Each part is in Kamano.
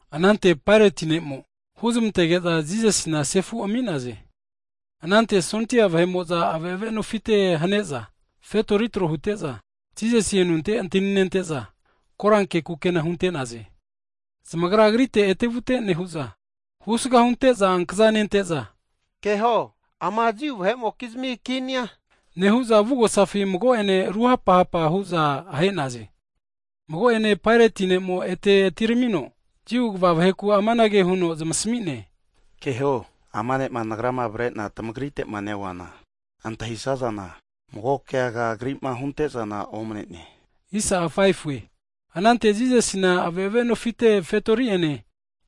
Anante Paeroti'a huzmantege'za Jisasina sefu ami'naze. Anante sondia vahe'mo'za ave'ave nofite kini vahe'mokizmi fetorikna huza tro hute'za, Jisasi anunte antani nente'za, koranke kukena hunte'naze. Zamagra Agrite ete'vute nehu'za, Husga hunte'za ankaza nente'za, Keho, ama Jiu vahe'mokizmi kinia! Nehu'za avugosafi mago'ene ruhapa hapa hu'za ahe'naze. Mago'ene Paeroti'a ete atiramino, Jiu kva vaheku amanage huno zamasmi'ne, Keho, ama ne'ma nagrama avare'na tmagrite'ma neoana, antahisazana mago keaga Agri'ma hunte'zana omne'ne. Anante Jisasina ave'ave nofite fetori'ene,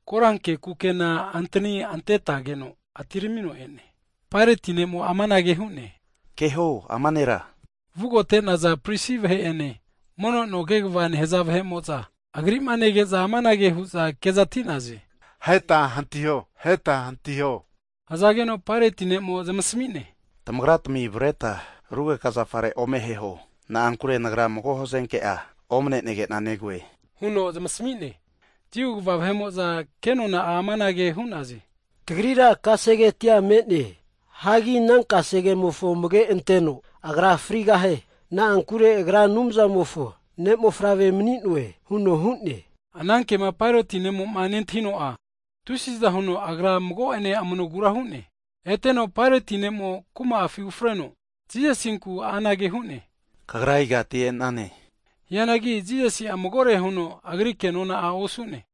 koranke kukena antani antetageno, atiramino e'ne. Paeroti'a anage hu'ne, Keho, ama Nera! Vugote'naza pris vahe'ene, mono no kegva nehza vahe'mo'za (gad) Agri'ma nege'za amanage hu'za kezati'naze, aheta hantiho, aheta hantiho! Hzageno Paeroti'a zamasmi'ne, Tamagratmi avretma rugeka zafare ome aheho, na'ankure nagra mago hazenke'a omne'nege'na negoe, huno zamasmi'ne. Jiu kva vahe'mo'za ke nona'a amanage hu'naze, Tagrira kasegetia me'ne, hagi ana kase kemofo amage' anteno Agra frigahie. Na'ankure Agra Anumzamofo Ne'mofavre mani'noe huno hu'ne. Ana kema Paeroti'a nentahino, tusiza huno agra mago'ene amanogura hu'ne. Eteno Paeroti'a kuma'afi ufreno, Jisasinku anage hu'ne, Kagra igati e'nane? Hianagi Jisasi'a magore huno agri kenona'a osu'ne.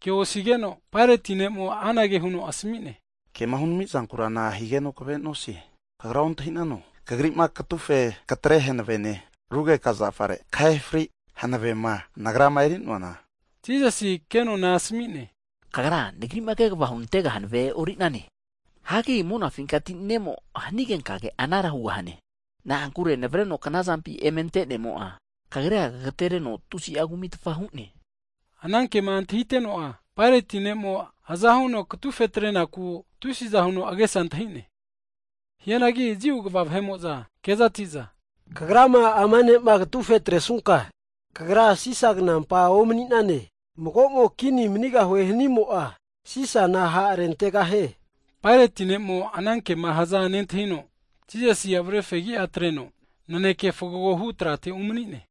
Ke osigeno, Paeroti'a anage huno asmi'ne, kema hunami'zankura nahigeno kave nosie? Kagra ontahi'nano, Kagri'ma katufe katre hanavene, rugeka zafare kahena hanti hanavema nagrama eri'noana? Jisasi ke nona'a asmi'ne, Kagra Anumzamoma hanavema onkamiasina, Nagri'ma kegva hunantega hanavea e'orintesine, hagi monafinkati ne'mo hanigenka anara hugahane. Na'ankure navreno kzampima eme ante'nemo'a, kagrira kagatereno tusi'a kumi hu'ne. Ana kema antahiteno'a Paeroti'a aza huno katufe atrenaku tusiza huno agesa antahi'ne. Hianagi Jiu kva vahe'mo'za kezati'za, kagrama ama ne'ma katufe atresunka, kagra Sisa knampa omni'nane! Mago'mo kini manigahue hanimo'a, Sisana ha' rentegahie. Paeroti'a ana kema haza nentahino, Jisasi avare fegi'a atreno naneke fgagohu trate umani'ne,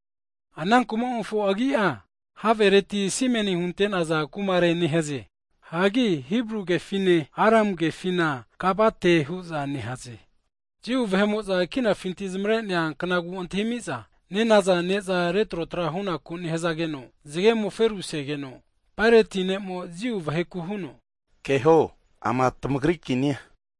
ana kumamofo agi'a, Havereti simeni hunte'naza kumare nehaze, hagi Hibru/Arami kefina, Gabate hu'za nehaze. Jiu vahe'mo'za kinafinti zamare'nea knagu antahimiza nenaza (Pasova) ne'za retro tra hunaku nehzageno, zgemo'a feru asegeno Paeroti'a Jiu vaheku huno, Keho, ama tamagri Kinia!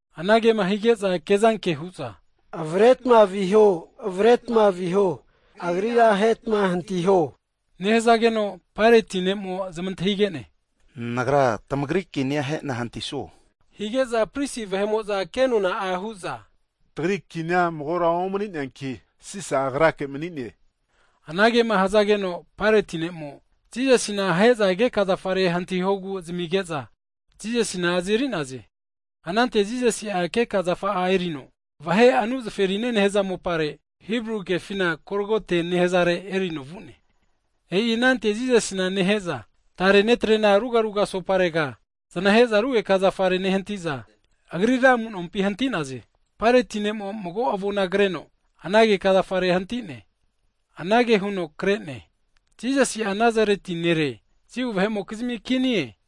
Anagema hige'za kezanke hu'za, Avretma viho, avretma viho, Agrira ahetma hantiho! Nehzageno Paeroti'a zamantahige'ne, Nagra, tamagri Kinia ahena hantisuo? Hige'za pris vahe'mo'za ke nona'a hu'za, Tagri kinia magora omni'neanki, Sisa agrake mani'ne. Anagema hzageno Paeroti'a Jisasina ahe'zama keka zafare hantihogu zamige'za Jisasina azeri'naze. Anante Jisasi'a keka zafa'a erino, vahe anu zaferine nehaza mopare, Hibru kefina Golgote nehazare erino vu'ne. E'i anante Jisasina nehe'za, tare netrena ruga raga asopare znahe'za rugeka zafare nehanti'za, Agrira amu'nompi hanti'naze. Paeroti'a mago avona kreno, ana keka zafare hanti'ne. Anage huno kre'ne, JISASI'A NAZARETI NERE, JIU VAHE'MOKIZMI KINIE.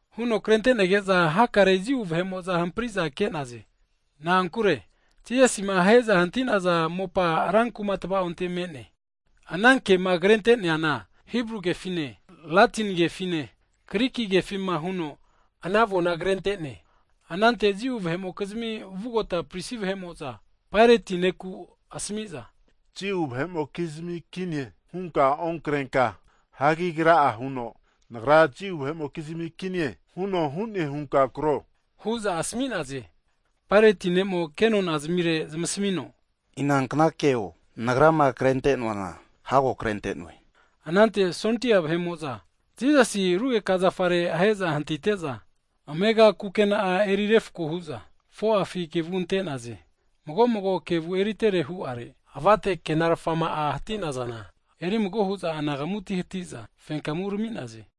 Huno krente'nege'za hakare Jiu vahe'mo'za hampri'za ke'naze. Na'ankure Jisasima ahe'za hanti'naza mopa, rankuma tva'onte me'ne, ana kema krente'neana Hibru kefine, Latini kefine, Griki kefima huno ana avona krentene. Anante Jiu vahe'mokizmi vugota pris vahe'mo'za Paerotina asmi'za, Jiu vahe'mokizmi Kinie hunka onkrenka, hagi Agra'a huno, Nagra Jiu vahe'mokizmi Kinie huno hu'ne hunka kro hu'za asmi'naze. Paeroti'a ke nonazmire zamasmino, Inankna keo nagrama krente'noana hago krente'noe. Anante sondia vahe'mo'za, Jisasi rugeka zafare ahe'za hantite'za, amegati kukena'a eri refko hu'za 4'a kevu ante'naze, mago'mo mago kevu eritere hu'are, avate kukena'ama hati'nazana eri mago hu'za anagamuti hati'za fenkamu urami'naze.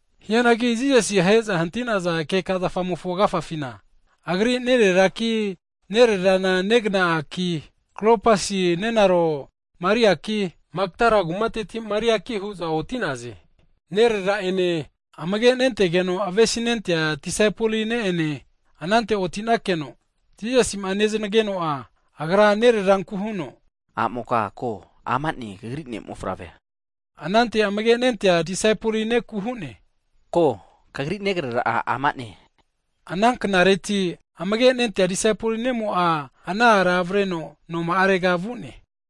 Hianagi Jisasi ahe'za hanti'naza keka zafamofo agafafina, Agri nereraki, nererana nenunknaki, Klopas nenaro Mariaki, Magdala kumateti Mariaki hu'za oti'naze. Nerera'ene, amage' nentegeno avesi nentea disaipoli ne' ene anante oti'nakeno Jisasi'ma neznageno'a, Agra nereranku huno, A'moka ko, ama'ne kagri ne'mofavrea! Anante amage' nentea disaipoli neku hu'ne, Ko, kagri negrera'a ama'ne! Ana knareti agafa huno amage' nentea disaipoli ne'mo ana ara avreno noma'are vu'ne.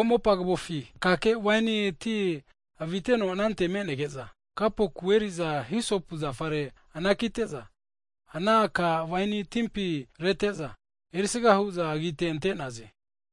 Mago mopa kavofi akake waini ti aviteno anante menege'za, kapuki eri'za hisopu zafare anakite'za, ana aka waini timpi rete'za (spons) erisaga hu'za agite ante'naze.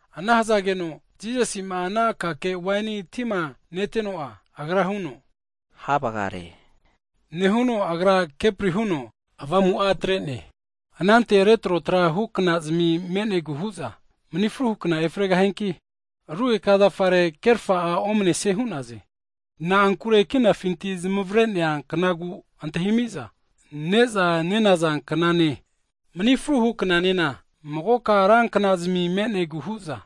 Ana hzageno Jisasi'ma ana akake waini tima neteno'a, Agra hu'ne, Ha vgare! nehuno Agra kepri huno avamu'a atre'ne. Anante retrotra huknazmi me'negu hu'za, mni fruhu kna (sabat) efregahianki rugeka zafare kerfa'a omnesie hu'naze, (na'ankure kinafinti zamavre'nea knagu antahimiza ne'za nenaza knane, mni fruhu (sabat) knanena magoka ra kna'zmi me'negu hu'za,)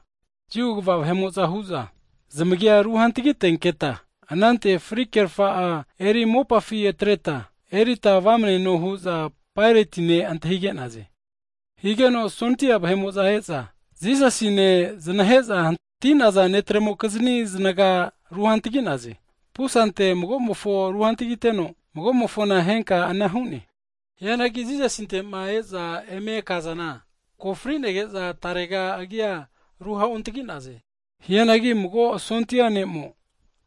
Jiu kva vahe'mo'za huza, zamagia ru hantagi tenketa, anante fri kerfa eri mopafi atreta, erita vamneno hu'za Paeroti antahige'naze. Higeno sondia vahe'mo'za e'za, Jisasine znahe'za hanti'naza netremo'kizni znaga ru hantagi'naze, pusante mago'mofo ru'hantagiteno, mago'mofona henka ana hu'ne. Hianagi Jisasinte'ma e'za eme kazana, ko fri'nege'za tarega agia ruha'ontagi'naze. Hianagi mago sondia ne'mo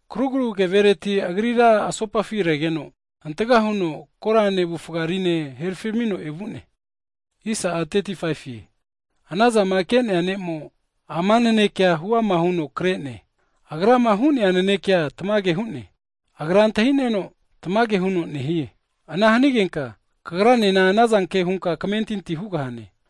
krugru kevereti Agrira asopafi regeno, hantaka huno korane, avufa rimo'ene herfino evu'ne. E'i ana zama ke'nea ne'mo ama naneke huama huno kre'ne, agrama hu'nea nanekea tamage hu'ne, agra antahi'neno tamage huno nehie. Ana hanigenka kagranena anazanke hunka kmentinti hugahane.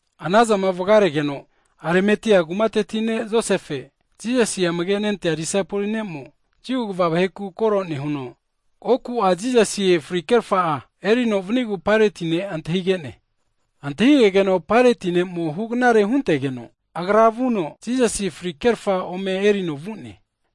Anazama vgaregeno Arimatia kumateti ne' Josefe, Jisasi amage' nentea disaipoli ne'mo, Jiu kva vahe koro nehuno oku'a Jisasi fri'kerfa erino vanigu Paerotina antahige'ne. Antahigegeno Paeroti'a hugnare huntegeno agra vuno Jisasi fri'kerfa ome erino vu'ne.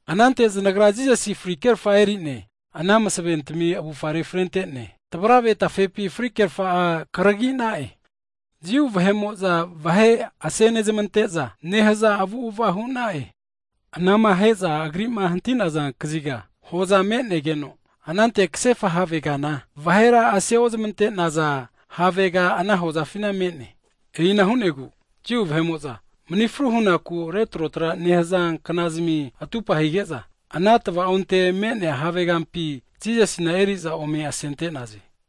Anante znagra Jisasi fri'kerfa eri'ne, ana masaventami avufare frente'ne, tvarave tafepi frikerfa'a kargina'e. Jiu vahe'mo'za vahe ase nezmante'za nehaza avu'ava hu'na'e. Anama ahe'za Agri'ma hanti'naza kaziga hoza me'negeno, anante ksefa havegana, vahera ase ozmante'naza havega ana hozafina me'ne. E'ina hu'negu Jiu vahe'mokizmi mni fru hunaku retro tra nehaza kna'zmi (sabat) atupa hige'za, ana tva'onte me'nea havegampi Jisasina eri'za ome asente'naze.